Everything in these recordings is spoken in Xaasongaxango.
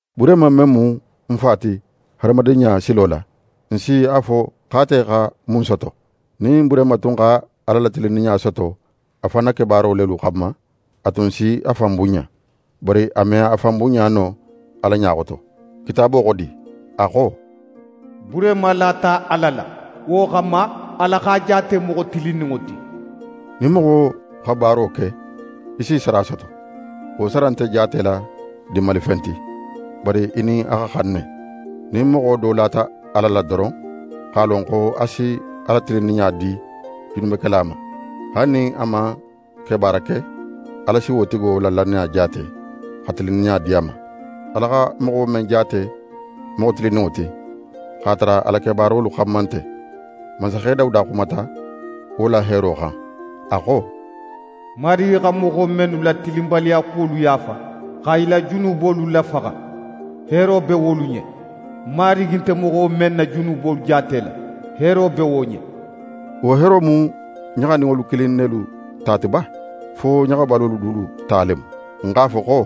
Burehima men mu n fa ti hadamadinɲa silo la, n si a fo x'ate xa mun soto? Nin Burehima tun xa Ala la tilinninɲa soto a fan na kebaaro lelu xanma, a tun si a fan bunɲa. Bari a me a fan bunɲa no Ala ɲa xoto. Kitaabo xo di? A xo: «Burehima lata Ala la. Wo xanma, Ala x'a jaate moxo tilinninŋo ti.» Nin moxo xa baaro ke, í s'í sara soto. Wo sara nte jaatela dinmalifen ti, bari í nin a xa xan ne. Nin moxo do lata Ala la doron, x'a lon xo a si a la tilinninɲa di junubekela ma, haali nin a man kebaara ke, Ala si wo tigo la lannaya jaate, xa tilinninɲa di a ma. Ala xa moxo men jaate moxo tilinninŋo ti, x'a tara a la kebaarolu xanma nte, mansaxe Dawuda xumata wo la heero xan, a xo: «Marigi xa moxo mennu la tilinbaliyakuwolu yaafa, xa i la junubolu lafaxa, heero be wolu ɲen. Marigi nte moxo men na junubolu jaatela, heero be wo ɲen!» Wo heero mu ɲaxaninŋolu kilin nelu ta ti ba, fo ɲaxabalolu dulu ta le mu? N x'a fo xo: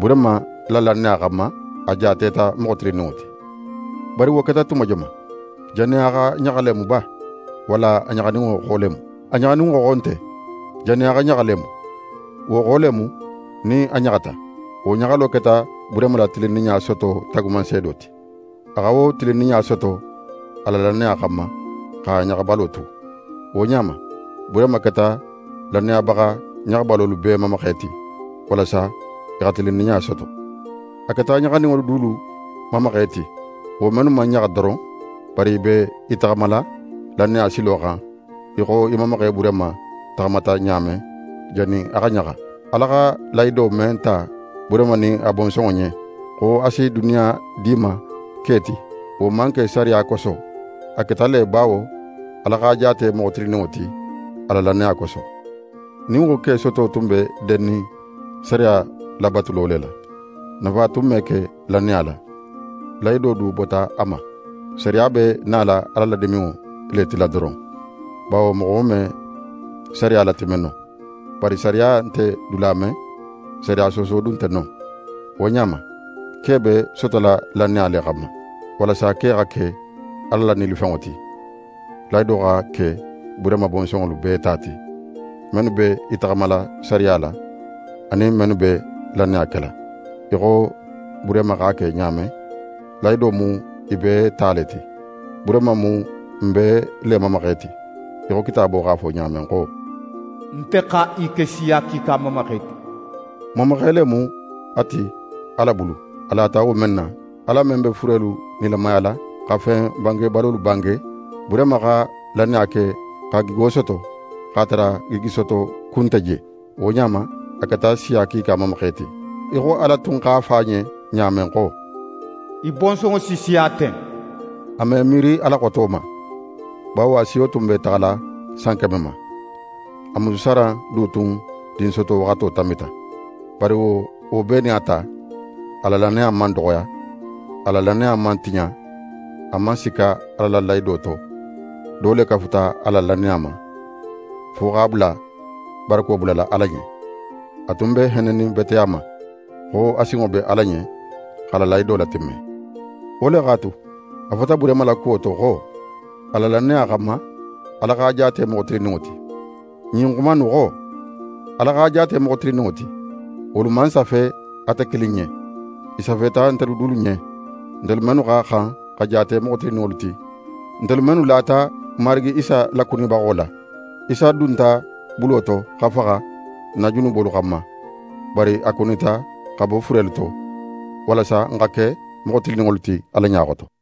«Burehima la lannaya xanma, a jaateta moxo tilinninŋo ti.» Bari wo keta tuma joman? Jannin a xa ɲaxa le mu ba, walla a ɲaxaninŋo xo le mu? A ɲaxaninŋo xo nte; jannin a xa ɲaxa le mu. Wo xo le mu, nin a ɲaxata. Wo ɲaxalo keta Burehima la tilinninɲa soto taagumanseedo ti. A xa wo tilinninɲa soto a la lannaya xanma, x'a ɲaxabalo tu. Wo ɲa ma, Burehima keta lannayabaxa ɲaxabalolu bee mamaxe ti, walasa i xa tilinninɲa soto. A keta ɲaxaninŋolu dulu mamaxe ti, wo mennu man ɲaxa doron, bari i be i taxamala lannaya silo xan, í xo n mamaxe Burehima taxamata ɲa men, jannin a xa ɲaxa. Ala xa lahido men ta Burehima nin a bonsonŋo ɲen, xo a si duniya di i ma ke ti, wo man ke sariya koso. A keta le bawo Ala x'a jaate moxo tilinninŋo ti a la lannaya koso. Nin wo ke soto tun be dennin sariya labatulo le la, nafa tun me ke lannaya la; lahido du bota a ma. Sariya be nala Ala la diminŋo le tila doron, bawo moxo me sariya latimme no. Bari sariya nte dula men, sariya sooso du nte non. Wo ɲa ma, ke be sotola lannaya le xanma, walasa ke xa ke Ala la nilifenŋo ti, lahido xa ke Burehima bonsonŋolu bee ta ti. Mennu be i taxamala sariya la, anin mennu be lannaya kela, í xo Burehima x'a ke ɲa men, lahido mu i bee ta le ti. Burehima mu n bee le mamaxe ti, í xo Kitaabo x'a fo ɲa men xo: «Nte xa í ke siya kiika mamaxe ti.» N mamaxe le mu a ti Ala bulu, a lata wo men na, Ala men be furelu nilamayala, xa fen bangebalolu bange. Burehima xa lannaya ke xa gigo soto, x'a tara gigisoto ku nte je. Wo ɲa ma, a keta siya kiika mamaxe ti, í xo Ala tun x'a fo a ɲen ɲa men xo: «Í bonsonŋo si siya ten.» A m'é miiri a la xoto ma, bawo a siyo tun be taxala san keme ma. A musu Saran du tun dinsoto waxato tanbita. Bari wo bee nin a ta, a la lannaya man doxoya. A la lannaya man tiɲa, a man sikka Ala la lahido to, do le kafuta a la lannaya ma, fo x'a bula barako bulala Ala ɲen. A tun be hennenin bete a ma, xo a sinŋo be Ala ɲen x'a la lahido latimme. Wo le x'a tu, a fota Burehima la kuwo to xo: «A la lannaya xanma, Ala x'a jaate moxo tilinninŋo ti.» Ɲin xuma innu xo: «Ala x'a jaate moxo tilinninŋo ti», wolu man safe ate kilin ɲen. I safeta ntelu dulu ɲen, ntelu mennu xa xan xa jaate moxo tilinninŋolu ti, ntelu mennu lata n Marigi Isa lakunibaxo la. Isa dunta bulo to xa faxa n na junubolu xanma; bari a kunita xa bo furelu to, walasa n xa ke moxo tilinninŋolu ti Ala ɲa xoto.